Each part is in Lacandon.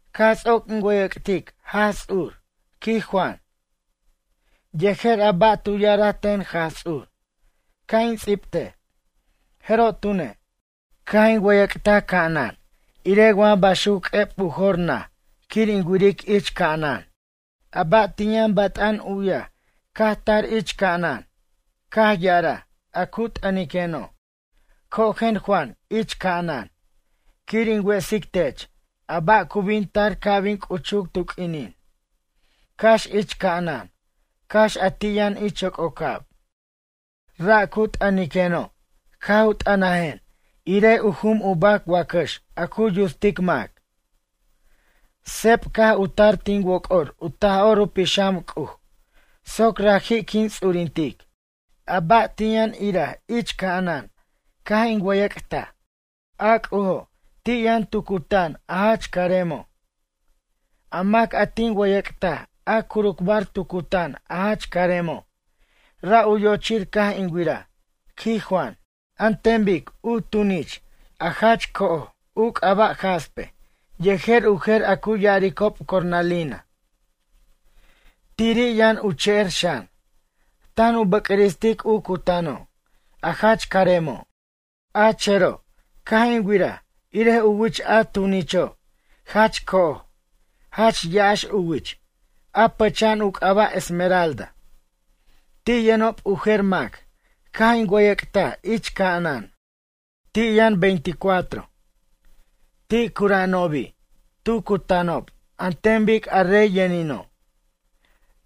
Caj ts'oc in wʌyʌc'tic Jaj Ts'ur, quij Juan, yejer a ba' tu ya'araj ten Jaj Ts'ur ca' in ts'ibtej. Jeroj tune', caj in wʌyʌc'taj ca'anan irej wa baxuc q'ueb u jor naj quir in wiric ich ca'anan. A ba' tin yʌn bat'an u'yaj caj tar ich ca'anan, caj ya'araj a cu t'ʌniqueno': ―Cojen Juan ich ca'anan, quir in wesic tech a ba' cu bin tar ca' bin c'uchuc tu q'uinin, cax ich ca'anan, cax a ti' yʌn ich yoc'ocab. Ra' cu t'ʌniqueno' caj u t'ʌnajen irej jum u bac wacax a cu yutsic mac. Seb caj u tar tin woc'or u Taj'or u Pixam C'uj soc raji' quin ts'urintic. A ba' tin yʌn iraj ich ca'anan caj in wʌyʌc'taj, a C'ujo', ti' yʌn tu cutan a jach caremo'. A mac a tin wʌyʌc'taj a curucbar tu cutan a jach caremo', ra' u yochir caj in wiraj, quij Juan, an ten bic u tunich a jach co'oj u c'aba' jaspe yejer u jer a cu ya'aricob cornalina. Tiri' yʌn u cher xan, tan u bʌcristic u cutano' a jach caremo'. A chero', caj in wiraj irej u wich a tunicho', jach co'oj, jach ya'ax u wich, a pʌcha'an u c'aba' esmeralda. Ti' yʌnob u jer mac caj in wʌyʌc'taj ich ca'anan. Ti' yʌn veinticuatro. Ti' cura'anobi' tu cutanob an ten bic a rey yʌnino'.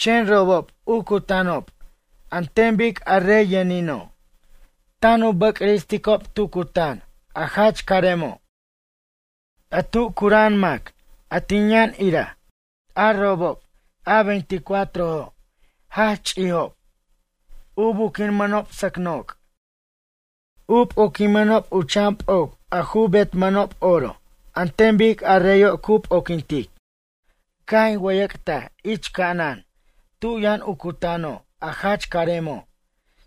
Chen robob u cutanob an ten bic a rey yʌnino', tan u bʌcristicob tu cutan a jach caremo' a tu cura'an mac a tin yʌn iraj. A robob a veinticuatrojo', jach ch'ijob. U buquimʌnob sʌc noc'. U p'oquimʌnob u chan p'oc betmanob oro an ten bic a reyo' cu p'oquintic. Caj in wʌyʌc'taj ich ca'anan tu yʌn u cutano' a jach caremo',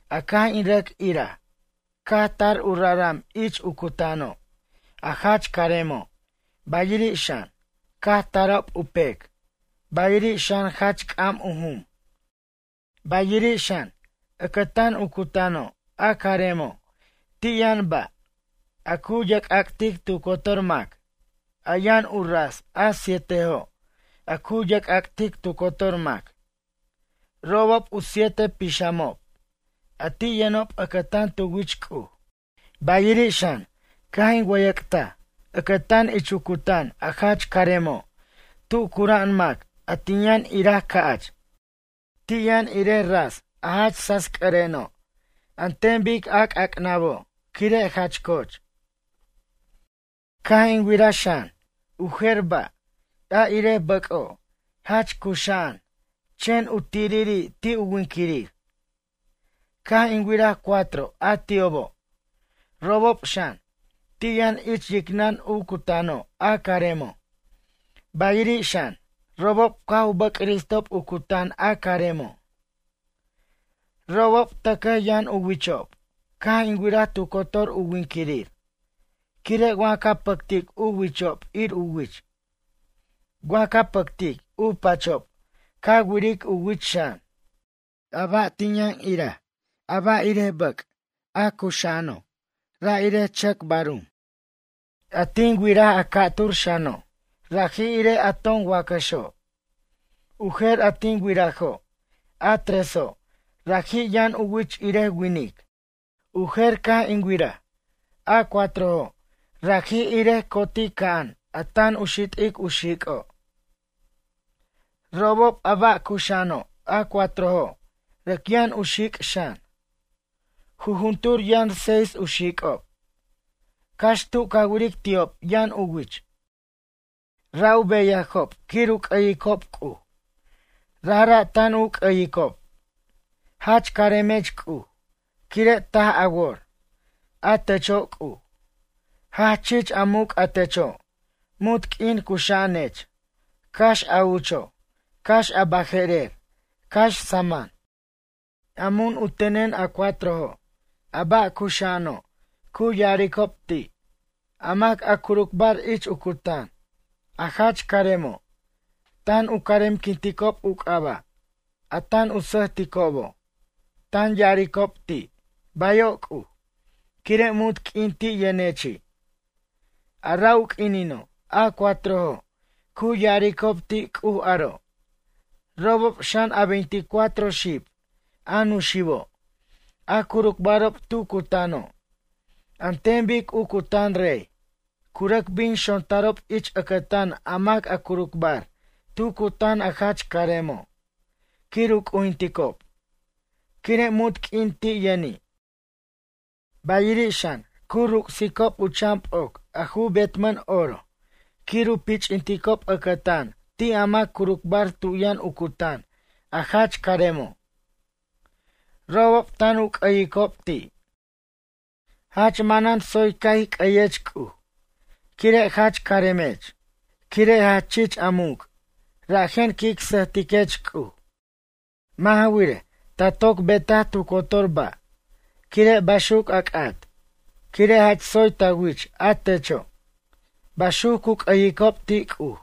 a caj in rʌc iraj, caj tar u raram ich u cutano', a jach caremo', bayiri' xan, caj tarob u pec, bayiri' xan jach c'am u jum. Bayiri' xan, ʌcʌtan u cutano' a caremo', ti' yʌn ba' a cu yerc'ac'tic tu cotor mac, a yʌn u ras a sietejo' a cu yerc'ac'tic tu cotor mac. Robob u siete pixamob, a ti' yʌnob ʌcʌtan tu wich C'uj. Bayiri' xan, caj in wʌyʌc'taj ʌcʌtan ich u cutan a jach caremo' tu cura'an mac a tin yʌn iraj ca'ch, ti' yʌn irej ras a jach sasc'ʌreno' an ten bic a c'ac'nabo' quire jach coch. Caj in wiraj xan, u jer ba' a irej bʌc'o', jach cuxa'an, chen u tiriri' ti' u winquirir. Caj in wiraj cuatro a ti'obo'. Robob xan, ti' yʌn ich yicnʌn u cutano' a caremo', bayiri' xan, robob caj u bʌcristob u cutan a caremo'. Robob tʌcʌj yʌn u wichob, caj in wiraj tu cotor u winquirir, quire' wa ca pʌctic u wichob ir u wich. Wa ca pʌctic u pachob ca wiric u wich xan. A ba' tin yʌn iraj, a ba' irej bʌc', a cuxa'ano', ra' irej chʌc barum. A tin wiraj a ca'tur xano', raji' irej a ton wacaxo'. U jer a tin wirajo', a treso', raji' yʌn u wich irej winic. U jer caj tin wiraj, a cuatrojo' raji' irej cotica'an a tan u xit'ic u xic'o'. Robob, a ba' cuxa'ano', a cuatrojo', rʌc yʌn u xic' xan. Jujuntur yʌn seis u xic'ob. Cax tu ca wiric ti'ob yʌn u wich. Ra' u beyajob quir u c'ʌyicob C'uj. Rajra' tan u c'ʌyicob: Jach caremech C'uj quire' taj a wor, a techo' C'uj. Jach chich a muc' a techo', munt q'uin cuxa'anech, cax a ucho', cax a baje'rer, cax saman. A mun u tenen a cuatrojo' a ba' cuxa'ano' cu ya'aricob ti', a mac a curucbar ich u cutan, a jach caremo', tan u caremquinticob u c'aba', a tan u sʌjticobo', tan ya'aricob ti': “Bayo' C'uj”, quire' munt q'uin ti' yʌnechi'. A ra' u q'uinino' a cuatrojo' cu ya'aricob ti' C'uj aro', robob xan a veinticuatro xib a nuxibo', a curucbarob tu cutano', an ten bic u cutan rey, cu rʌc bin xontarob ich ʌcʌtan a mac a curucbar tu cutan a jach caremo' quir u c'ujinticob, quire' munt q'uin ti' yʌni'. Bayiri' xan, cu ruc'sicob u chan p'oc a ju betmʌn oro quir u pich'inticob ʌcʌtan ti' a mac curucbar tu yʌn u cutan a jach caremo'. Robob tan u c'ʌyicob ti': Jach manan tsoy ca' ij c'ʌyech C'uj, quire' jach caremech, quire' jach chich a muc', rajen quic sʌjtiquech C'uj. Mʌ' ja wirej, ta toc betaj tu cotor ba', quire' baxuc a c'at, quire' jach tsoy ta wich a techo'. Baxuc cu c'ʌyicob ti' C'uj.